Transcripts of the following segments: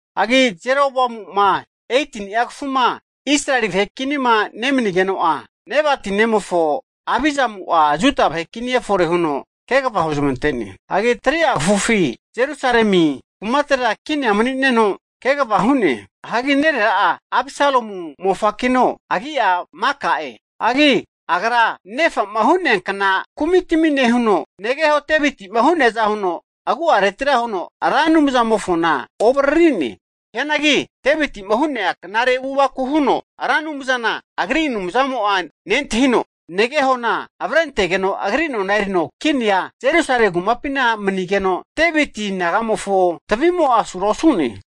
Hagi Jeroboamu'ma 18ni'a kafuma Israeli vahe kinima nemanigeno'a, Nebati nemofo Abizamu'a Juda vahe kini efore huno kegava huzmante'ne. Hagi 3'a kafufi Jerusalemi kumatera kinia mani'neno kegava hu'ne. Hagi nerera'a Abisalomu mofakino, agi'a Maka'e. Hagi agra nefa'ma hu'neankna kumitami nehuno, negeho Deviti'ma hu'neaza huno agu'aretira huno Ra Anumzama'amofona ovariri'ne. Hianagi Deviti'ma hu'nea knare avu'avaku huno Ra Anumzana agri Anumzamo'a nentahino, negehona avrentegeno agri nona erino kinia Jerusalem kumapina manigeno, Deviti nagamofo tavimo'a asura osu'ne.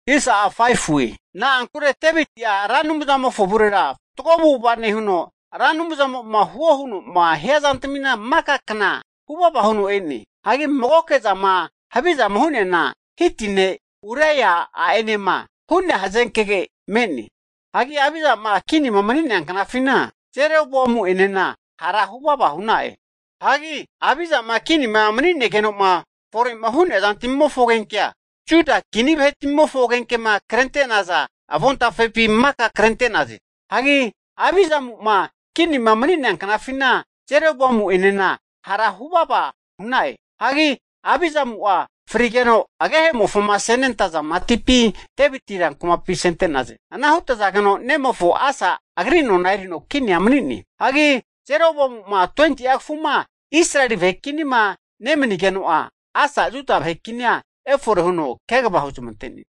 Na'ankure Deviti'a Ra Anumzamofo avurera fatgo avu'ava nehuno, Ra Anumzamo'ma huo huno'ma hia zantamina maka kna hu vava huno e'ne. Hagi magoke zama havizama hu'neana, Hiti ne' Uraia a'enema hu'nea hazenkege me'ne. Hagi Abizama kinima mania knafina Jeroboamu'enena hara hu vava hu'na'e. Hagi Abizama kinima mani'negeno'ma fore'ma hu'nea zantmimofo agenkea, Juda kini vahetmimofo agenkema krente'naza avontafepi maka krente'naze. Hagi Abizamu'ma kinima mania knafina Jeroboamu'enena hara hu vava hu'na'e. Hagi Abizamu'a frige'za agehemofoma asente'naza matipi Deviti rankumapi asente'naze. Ana hutazageno ne'mofo Asa agri nona erino kinia mani'ne. Hagi Jeroboamu'ma 20'a kafuma Israeli vahe kinima nemanigeno'a, Asa'a Juda vahe kini efore huno kegava huzmante'ne.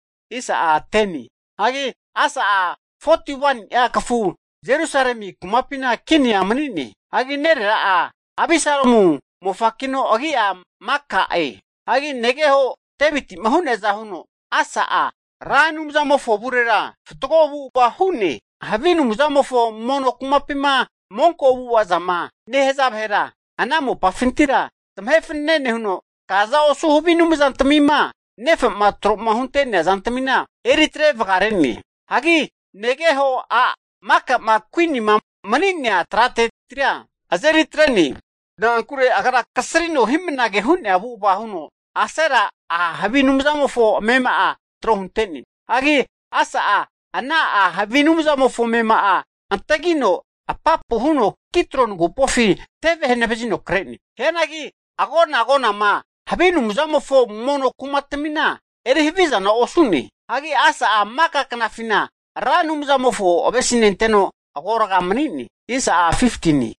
Hagi Asa'a 41ni'a kafu Jerusalemi kumapina kinia mani'ne. Hagi nerera'a Abisalomu mofakino agi'a Maka'e. Hagi negeho Deviti'ma hu'neaza huno Asa'a Ra Anumzamofo avurera fatgo avu'ava hu'ne. Havi anumzamofo mono kumapima monko avu'ava zama nehaza vahera ana mopafintira zamahe fanane nehuno, kaza osu havi anumzantamima nefa'ma tro'ma hunte'nea zantamina eritre vagare'ne. Hagi negeho a' Makama kuinima mani'nea tratetira azeri atre'ne. Na'ankure agra kasrino hi'mnage hu'nea avu'ava huno Asera a' havi anumzamofo amema'a tro hunte'ne. Hagi Asa'a ana a' havi anumzamofo amema'a antagino apapu huno Kidroni agupofi teve hanavazino kre'ne. Hianagi agona agonama havi anumzamofo mono kumatmina eri havizana osu'ne. Hagi Asa'a maka knafina Ra Anumzamofo avesinenteno agorga mani'ne.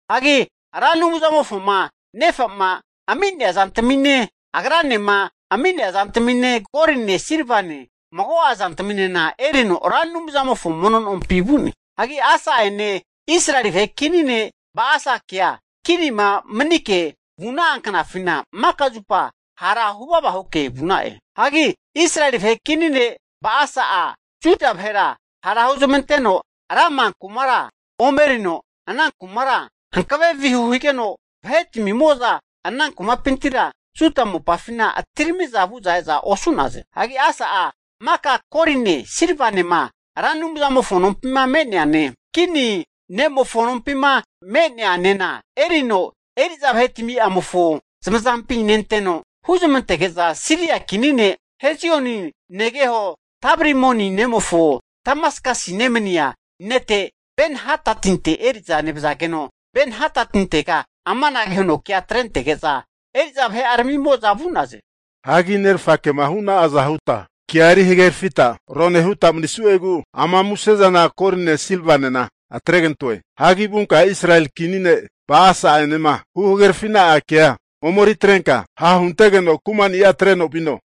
Hagi Ra Anumzamofoma nefa'ma ami'nea zantamine, agranema ami'nea zantamine, goline, silvane, mago'a zantaminena erino Ra Anumzamofo mono nompi vu'ne. Hagi Asa'ene Israeli vahe kini ne' Ba'asakea kinima manike vu'na'a knafina, maka zupa hara hu vava huke vu'na'e. Hagi Israeli vahe kini ne' Ba'asa'a Juda vahera ha' huzmanteno Rama kumara omerino, ana kumara hankave vihu higeno, vahetmimo'za ana kumapintira Juda mopafina atiramiza vu'za eza osu'naze. Hagi Asa'a maka goline, silvanema Ra Anumzamofo nompima me'neane kini ne'mofo nompima me'neanena erino eri'za vahetami'amofo zamazampi nenteno, huzmantege'za Siria kini ne' Hezioni negeho Tabrimoni nemofo Damaskasi nemania nete Ben-hadadinte eri'za nevazageno, Ben-hadadintega amanage huno kea atrentege'za eri'za vahe'aramimo'za vu'naze. Hagi nerfakema hu'na'aza huta kea eri hagerafita rone huta manisu'egu ama musezana goline silvanena atregantoe. Hagi vunka Israeli kini ne' Ba'asa'enema huhagerafi'na'a kea omeritrenka ha'huntegeno kumani'a atreno vino.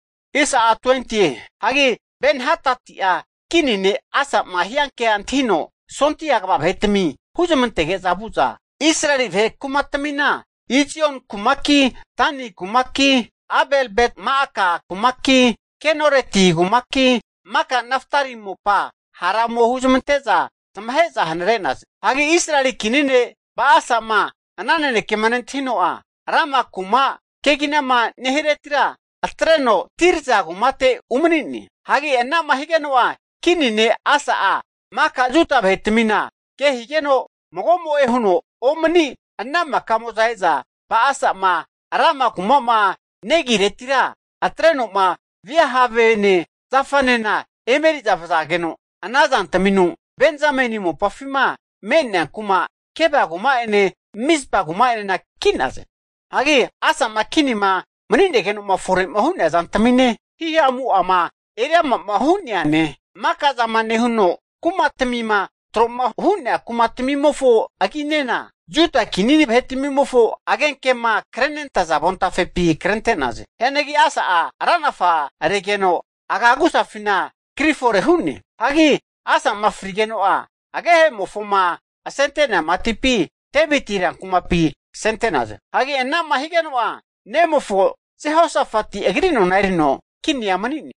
Hagi Ben-hadati'a kini ne' Asa'ma hianke antahino sondia kva vahetami huzmantege'za vu'za Israeli vahe kumatmina, Izoni kumaki, Dani kumaki, Abel-bet-ma'aka kumaki, Kenoreti kumaki, maka Naptali mopa hara ome huzmante'za zamahe'za hanare'naze. Hagi Israeli kini ne' Ba'asa'ma ana nanekema nentahino'a, Rama kuma keginama nehiretira atre'no Tirza kumate umani'ne. Hagi ana'ma higeno'a kini ne' Asa'a maka Juda vahetmina ke higeno mago'mo'e huno omani ana makamo'za e'za Ba'asa'ma Rama kuma'ma negiretira atreno'ma via havene zafanena emeri'za vazageno, ana zantaminu Benzameni mopafima me'nea kuma Geba kuma'ene Mizpa kuma'enena ki'naze. Hagi Asa'ma kinima mani'negeno fore'ma hu'nea zantamine, hihamu'ama eriamama hu'neane, maka zama nehuno kumatmina tro'ma hu'nea kumatamimofo aginena Juda kini vahetmimofo agenkema krenentaza avontafepi krente'naze. Hianagi Asa'a ranafa regeno, aga agusafina kri fore hu'ne. Hagi Asa'ma frigeno'a agehe'mofoma asente'nea matipi, Deviti rankumapi asente'naze. Hagi ana'ma higeno'a, nemofo Jehosafati agri nona erino kinia mani'ne.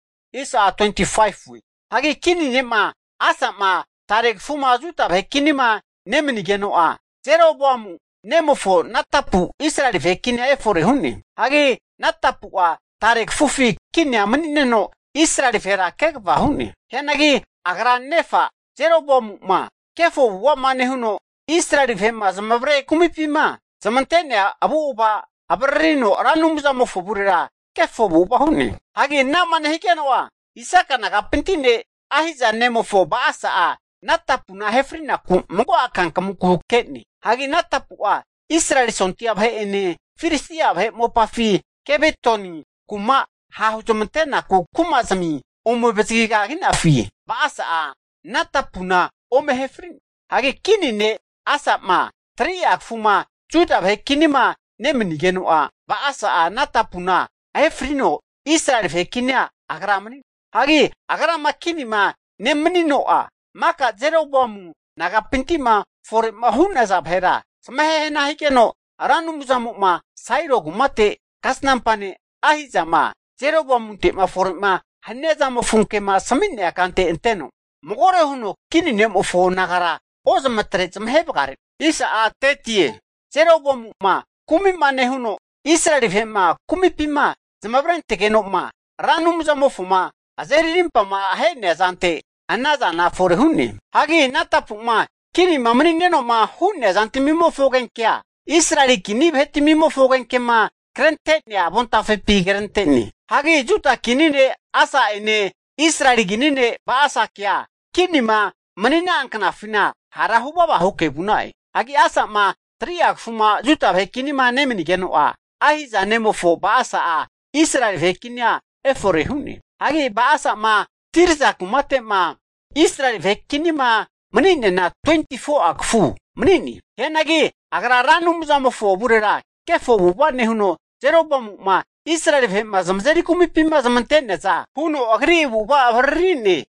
Hagi kini ne' Asa'ma tare kafuma Juda vahe kinima nemanigeno'a, Jeroboamu nemofo Nadapu Israeli vahe kinia efore hu'ne. Hagi Nadapu'a tare kafufi kinia mani'neno, Israeli vahera kegava hu'ne. Hianagi agra nefa Jeroboamu'ma kefo avu'ava'ma nehuno Israeli vahe'ma zamavare kumipima zamante'nea avu'ava avaririno Ra Anumzamofo avurera kefo avu'ava hu'ne. Hagi ana'ma nehigeno'a Isaka nagapinti ne' Ahiza nemofo Ba'asa'a Nadapuna ahe fri'naku mago'a kankamunku hakene. Hagi Nadapu'a Israeli sondia vahe'ene Filistia vahe mopafi Gibeton kuma vahe ha' huzmante'naku kumazimi ome avazagigaginafi, Ba'asa'a Nadapuna ome ahe fri'ne. Hagi kini ne' Asa'ma 3'a kafuma Juda vahe kinima nemanigeno'a, Ba'asa'a Nadapuna ahe nefrino Israeli vahe kinia agra mani'ne. Hagi agrama kinima nemanino'a, maka Jeroboamu nagapinti'ma fore'ma hu'naza vahera zamahe hana higeno, Ra Anumzamo'ma Sailo kumate kasnampa ne' Ahizama Jeroboamunte'ma fore'ma hania zamofo kema asami'nea kante anteno magore huno kini ne'mofo nagara ozmatre zamahe vagare'ne. Hagi Jeroboamu'ma kumi'ma nehuno, Israeli vahe'ma kumipima zamavarentegeno'ma Ra Anumzamofoma azeri arimpama ahe'nea zante, ana zana fore hu'ne. Hagi Nadapu'ma kinima mani'neno'ma hu'nea zantmimofo agenkea, Israeli kini vahetmimofo agenkema krente'nea avontafepi krente'ne. Hagi Juda kini ne' Asa'ene Israeli kini ne' Ba'asakea kinima mani'na'a knafina hara hu vava huke vu'na'e. Hagi Asa'ma 3'a kafuma Juda vahe kinima nemanigeno'a, Ahiza nemofo Ba'asa'a Israeli vahe kinia efore hu'ne. Hagi Ba'asa'ma Tirza kumate'ma Israeli vahe kinima mani'neana 24'a kafu mani'ne. Hianagi agra Ra Anumzamofo avurera kefo avu'ava nehuno, Jeroboamu'ma Israeli vahe'ma zamazeri kumipima zamante'neaza huno agri avu'ava avariri'ne.